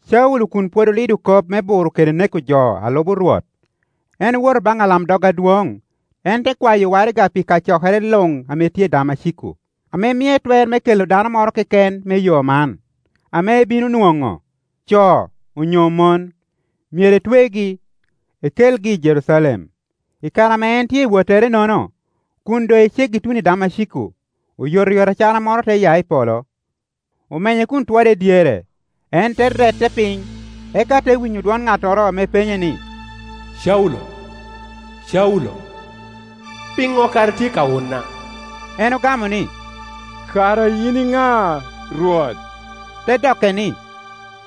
Caulo kun pwod olido kop me buro kede neko jo a lubo Rwot, en owoto baŋ alamdog adwoŋ. En te kwayo waraga pi kacokere luŋ ame tye i Damaciko, ame mie twer me kelo dano moro keken me Yo man, ame ebino nwoŋo, co onyo mon; myero etwegi, ekelgi i Jerucalem. I kare ame en tye i wottere-nono, kun doŋ eceggi tuno i Damaciko, oyotoyot acara moro te ya i polo, omenye kun otwode dyere. En te rette piny, eka te winyo dwon ŋattoro ame penye ni, “Caulo, Caulo, pi ŋo kara itye ka wuna?” En ogamo ni, “Kara yin iŋa, Rwot?” Te dokke ni,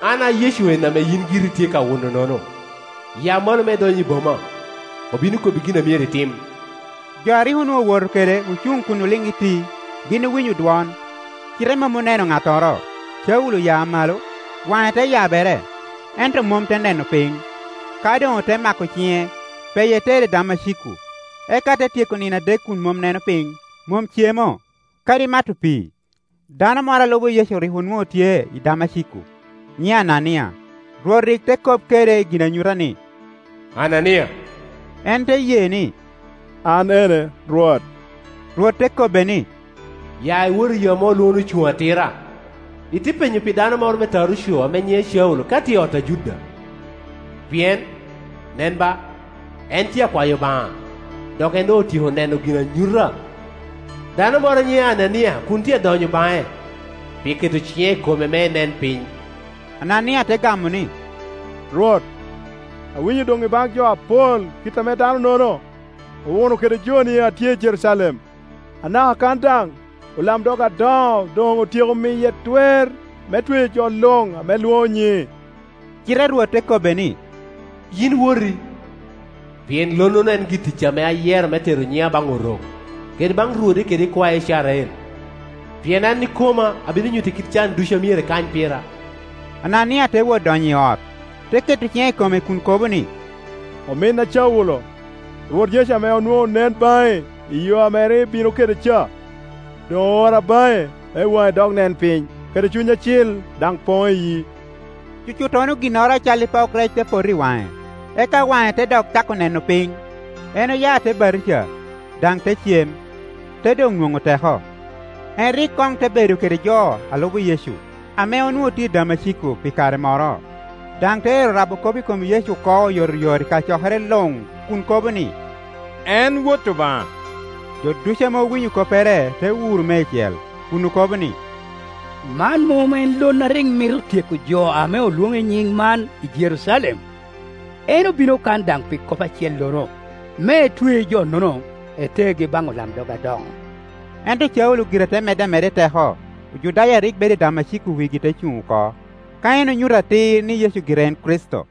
“An a Yecu en ame yin giri itye ka wuno-nono. Ya malo me idony i boma, obino kobbi gin a myero itim.” Jo a rik onwoŋo owoto kede ocuŋ kun oliŋ iti. Gin owinyo dwon, cite mom oneno ŋattoro. Caulo oya malo, waŋe te yabere, ento mom te neno piny. Ka doŋ ote mako ciŋe, peye tere i Damaciko. Eka te tyeko nino adek kun mom neno piny, mom cemo, kadi mato pii. Dano moro a lubo Yecu rik onwoŋo tye i Damaciko, nyiŋe Anania. Rwot rik te kop kede i ginanyuta ni, “Anania.” En te ye ni, “An ene, Rwot.” Rwot te kobbe ni, “Ya iwot i yo ame olwoŋo ni Ocuŋ Atira, ite penyo pi dano moro me Taruco ame nyiŋe Caulo ka tye i ot a Juda, pien, nen ba, en tye akwayo Obaŋa. Dok en doŋ otyeko neno i ginanyuta, dano moro a nyiŋe Anania kun tye adonyo baŋe, pi keto ciŋe i kome me enen piny.” Anania te gamo ni, “Rwot, awinyo doŋ i baŋ jo apol kit ame dano-nono owuno kede joni a tye i Jerucalem. Anaka kan daŋ olamdog adoŋo doŋ otyeko miye twer me tweyo jo luŋ ame lwoŋo nyiŋi.” Cite Rwot te kobbe ni, “Yin woti, pien lonnono en gi-ticca ame ayero me tero nyiŋa baŋ Orok, kede baŋ rwode kede ikwae Icrael. Pien an ikoma abino nyutte kit can ducu a myero ekany pira.” Anania te wot donyo i ot, te keto ciŋe i kome kun kobo ni, “Ominna Caulo, Rwot Yecu ame onwoŋo onen baŋi i yo a rik ibino kede ca, doŋ oora baŋi me waŋi dok nen piny, kede Cuny Acil daŋ poŋ iyii.” Cucuttono ginnoro acalli pok rec te poto i waŋe, eka waŋe te dok cako neno piny. En oya te batijia, daŋ te cem, te doŋ nwoŋo teko. Caulo orabo kop i Damaciko En rik koŋ te bedo kede jo a lubo Yecu ame onwoŋo tye i Damaciko pi kare moro, daŋ te ero rabo kop i kom Yecu oko oyotoyot i kacokere luŋ kun kobo ni, “En Wot Obaŋa.” Jo ducu ame owinyo koppere te wuro meicel, kun okobo ni, “Man mom en lon a rik mito tyeko jo ame olwoŋo i nyiŋ man i Jerucalem? En obino kan daŋ pi kop acellono, me etwe jo-nono, etergi baŋ olamdog adoŋo.” Ento Caulo gire te medde ameda i teko, Ojudaya a rik bedo i Damaciko wigi te cuŋ oko, ka en onyuto atir ni Yecu gire en Kricito.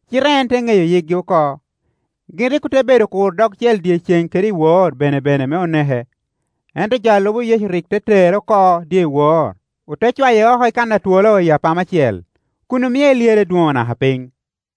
cite en te ŋeyo yikgi oko. Gin rik ote bedo kuro dogcel dyeceŋ kede iwor benebene me oneke; ento jo a lubo Yecu rik te tere oko dyewor, ore cwaye oko i kan a twolo i apama cel, kun omie elyerre i dwoŋo naka piny.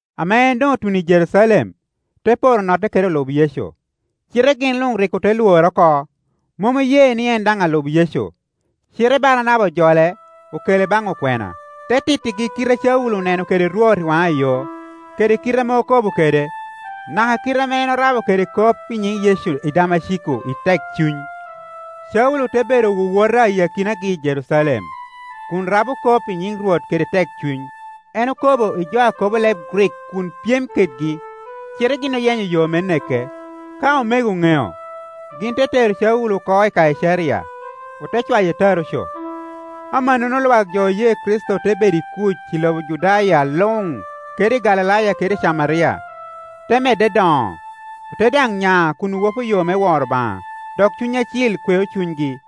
Ame en doŋ otuno i Jerucalem, te poro notte kede olub Yecu, cite gin luŋ rik ote lwore oko, mom oye ni en daŋ alub Yecu. Cite Baranaba ojole, okele baŋ okwena, te tittigi kite a Caulo oneno kede Rwot i waŋayo, kede kite ame okobo kede, naka kite ame en orabo kede kop i nyin Yecu i Damaciko i tekcuny. Caulo te bedo wowota i akinagi i Jerucalem, kun rabo kop i nyiŋ Rwot kede tekcuny. En okobo i jo a kobo leb Grik kun pyem kedgi, cite gin oyenyo yo me neke. Ka omego oŋeo, gin te tero Caulo oko i Kaicaria, ote cwaye Taruco. Amannono lwak jo oye Kricito te bedo i kuc i lobo Judaya luŋ kede i Galilaya kede i Camaria, te medde doŋo; ote daŋ nya kun owopo yo me woro Obaŋa, dok Cuny Acil kweo cunygi.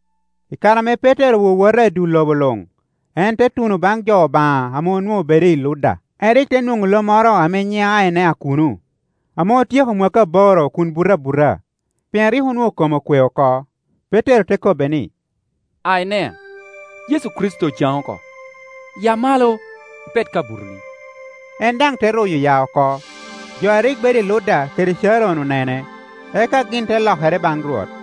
I kare ame Petero owowota i dul lobo luŋ, en te tuno baŋ jo Obaŋa ame onwoŋo bedo i Ludda. En rik te nwoŋo lo moro ame nyiŋe Ainea kuno, ame otyeko mwakki aboro kun buto abuta, pien rik onwoŋo kome okwe oko. Petero te kobbe ni, “Ainea, Yecu Kricito ocaŋi oko. Ya malo, ipet ka butoni.” En daŋ te ruyo ya oko. Jo a rik bedo i Ludda kede Caron onene, eka gin te lokere baŋ Rwot.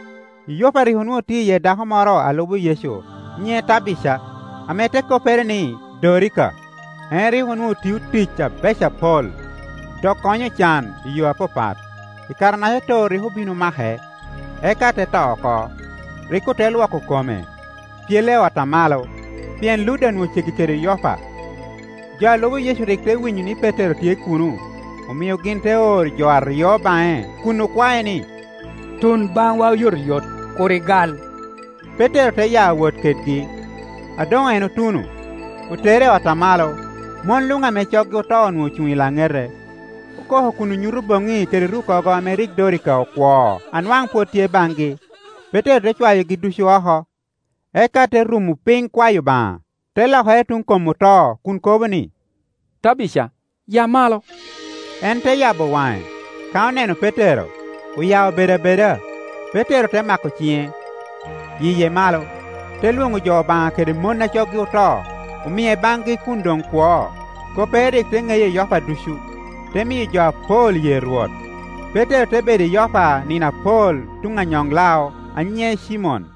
I Yopa rik onwoŋo tye iye dako moro a lubo Yecu nyiŋe Tabica, ame te koppere ni, Dorika Dorika te koppere Akal. En rik onwoŋo tio tic abeco apol, dok konyo ocan i yo apapat. I kare-naca too rik obin omake, eka te to oko. Rik ote lwoko kome, pyele i ot a malo. Pien Ludda onwoŋo ceggi kede Yopa, jo a lubo Yecu rik te winyo ni Petero tye kuno, omio gin te oro jo aryo baŋe, kun okwae ni, “Tun baŋwa oyotoyot, kur igal.” Petero te ya wot kedgi, A doŋ en otuno, otere i ot a malo. Mon luŋ ame coggi oto onwoŋo ocuŋ i laŋete, okoko kun onyuto boŋi kede rukkogo ame rik Dorika okwoo a nwaŋ pwod tye baŋgi. Petero te cwayogi ducu oko, eka te rumo piny kwayo Obaŋa; te lokere tuŋ kom oto kun kobo ni, “Tabica, ya malo,” En te yabo waŋe; ka oneno Petero, oya obedo abeda. Petero te mako ciŋe, yiye malo, te lwoŋo jo Obaŋa kede mon a coggi oto, omie baŋgi kun doŋ kwo. Koppere rik te ŋeye i Yoppa ducu, te miyo jo apol ye Rwot. Petero te bedo i Yoppa nino apol tuŋ anyoŋ-lao a nyiŋe Cimon.